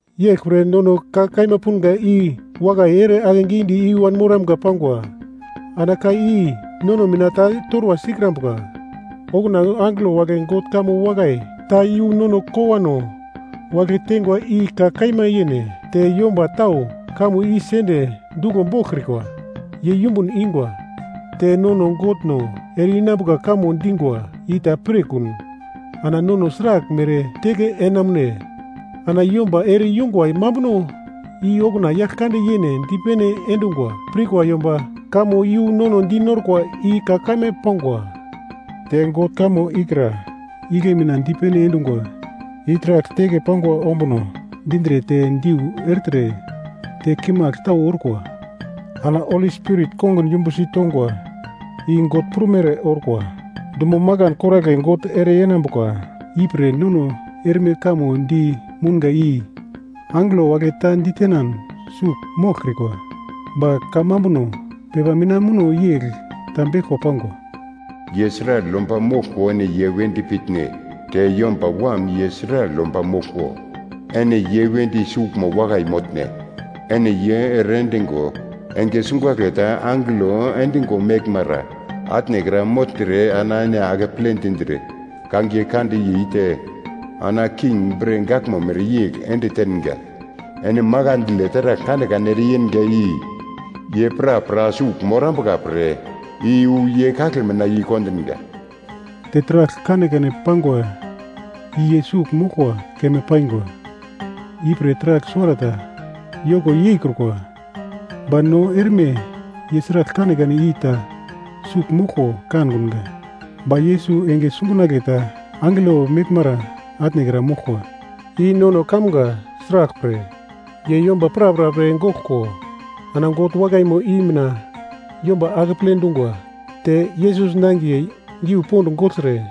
Yeglpre nono ka kaima punga i wakai ere akegidi i-wan moramga pangwa, ana ka i nono mina ta torwa sikrambuka. Okuna angelo wagle God kamo wakai ta iyu nono kowano wagle teingwa i ka kaima yene. Te yomba tau kamo i sende duglo boglkrikwa, ye yumbun ingwa. Te nono God no ere-inambuka kamo dingwa i ta pirkun, ana nono sraglmere teke enamune? Ana yomba ere-yungwa mambuno i okuna Yaglkande yene dipene endungwa pirkwa yomba, kamo yu nono dinorkwa i ka kaima pangwa. Te God kamo ikra igle mina dipene endungwa i taragl teke pangwa ombuno dindre te diu ertre, te kimagl tau orkwa, ana Holi Spirit, kongun yumbusi tongwa i God prumere orkwa. Dumo makan koragle God ere yenambuka ipre nono erme kamo di mounga i angelo wagle ta ditenan sugl moglkrikwa. Ba kamambuno pepa mina muno yegl ta beglko pangwa, “Ye sragl yomba moglko ene ye wedi pitne? Te yomba wam ye sragl yomba moglko ene ye wedi suglmo wakai motne? Ene ye ere endingo, enge sungagle ta angelo endingo meglmara atne kra mogltre, ana ene akeple dindre kangiye kande yei te ana king bre gaglmo mereyegl ende tenga. Ene makandle taragl kanekane ere yenga i ye prapra sugl morambuka pre i-wu ye kagle mina yei kondinga.” Te taragl kanekane pangwa i ye sugl moglkwa keme paingwa. Ipre taragl suwarata yoko yeikrukwa. Ba no erme ye sragl kanekane i ta sugl moglko kankunga. Ba Yesus enge sungagle ta angelo meglmara atnekra moglkwa i nono kamga, sraglpre, ye yomba prapra pre goglko, ana God wakaimo i mina yomba akeple dungwa. Te Yesus nangiye giu pond gogltre,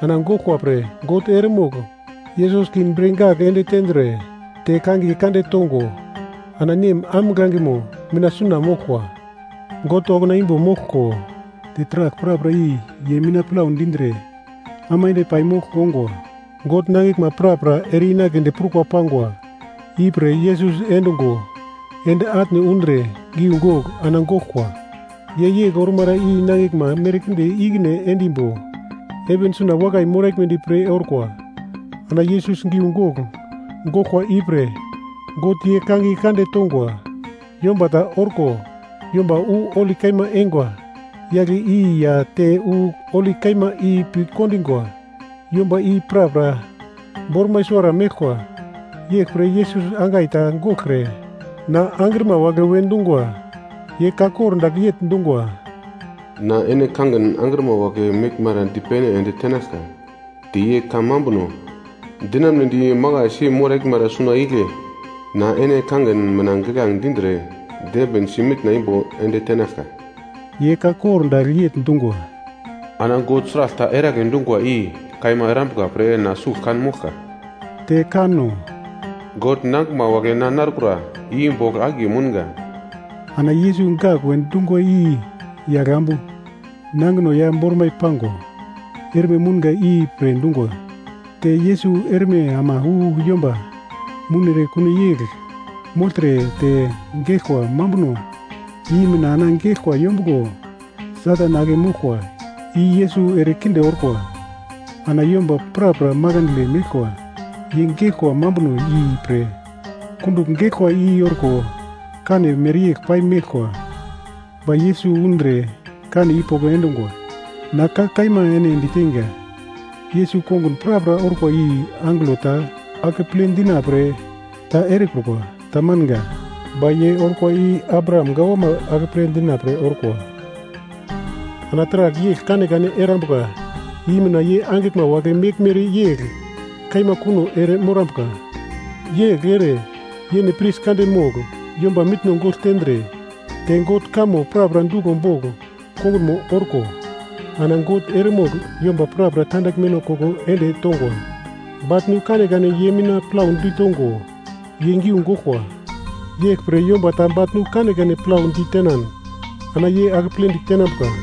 ana goglkwa pre God eremogl Yesus king bre gagl ende tendre, te kangiye kande tongo, ana Nem ambuglangemo mina suna moglkwa. God okuna imbo moglko, te taragl prapra i ye mina plau dindre aimande pai mogl ongwa. God nangiglma prapra ere-inagledi prukwa pangwa ipre Yesus endungo ende atne undre giugogl ana goglkwa. Ye yegl ormara i nangiglma merkinde ikine endimbo heven suna wakai moraglmedi pre orkwa. Ana Yesus giugogl goglkwa ipre God ye kangiye kande tongwa. Yomba ta orko yomba wu holi kaima eingwa yagle i ya te wu holi kaima pi kondingwa yomba i prapra bormai suwara meglkwa. Yeglpre Yesus angai ta goglkre na angrima wagle we dungwa. Ye ka kor dagl yegl dungwa, “Na ene kangin angrima wagle meglmara dipene ende tenaglka te ye kamambuno dinamnedi makaisi moraglmara suna igle na ene kangin mina giglange dindre dembinsi mitna imbo ende tenaglka.” Ye ka kor dagl yegl dungwa, “Ana God sragl ta eragle dungwa i kaima erambuka pre na sugl kan moglka.” Te kanno, “God nangiglma wagle na narkura i bogl akiye mounga.” Ana Yesus gak we dungwa i yagl ambu nangino ya bormai pango erme mounga ipre dungwa. Te Yesus erme ama wu yomba mounere kuno yegl mogltre te geglkwa mambuno i mina ana geglkwa yombuglo Satan ake moglkwa i Yesus ere kinde orkwa. Ana yomba prapra makandle meglkwa, ye geglkwa mambuno ipre kundugl geglkwa i orko kane mereyegl pai meglkwa, ba Yesus undre kane i poko endungwa. Na ka kaima ene diteinga, Yesus kongun prapra orkwa i angelo ta akeple dina pre ta erekrukwa. Tamanga, ba ye orkwa i Abraham gawama akeple dina pre orkwa. Ana taragl yegl kanekane erambuka i mina ye angiglma wagle meglmere yegl kaima kuno ere morambuka. Yegl ere yene pris kande mogl yomba mitno gogl tendre, te God kamo prapra duglo bogl kongunmo orko ana God eremogl yomba prapra tandaglmeno koko ende tongwa. Baglnu kanekane ye mina plau ditongo ye giu goglkwa. Yeglpre yomba ta baglnu kanekane plau ditenan ana ye akepledi tenambuka.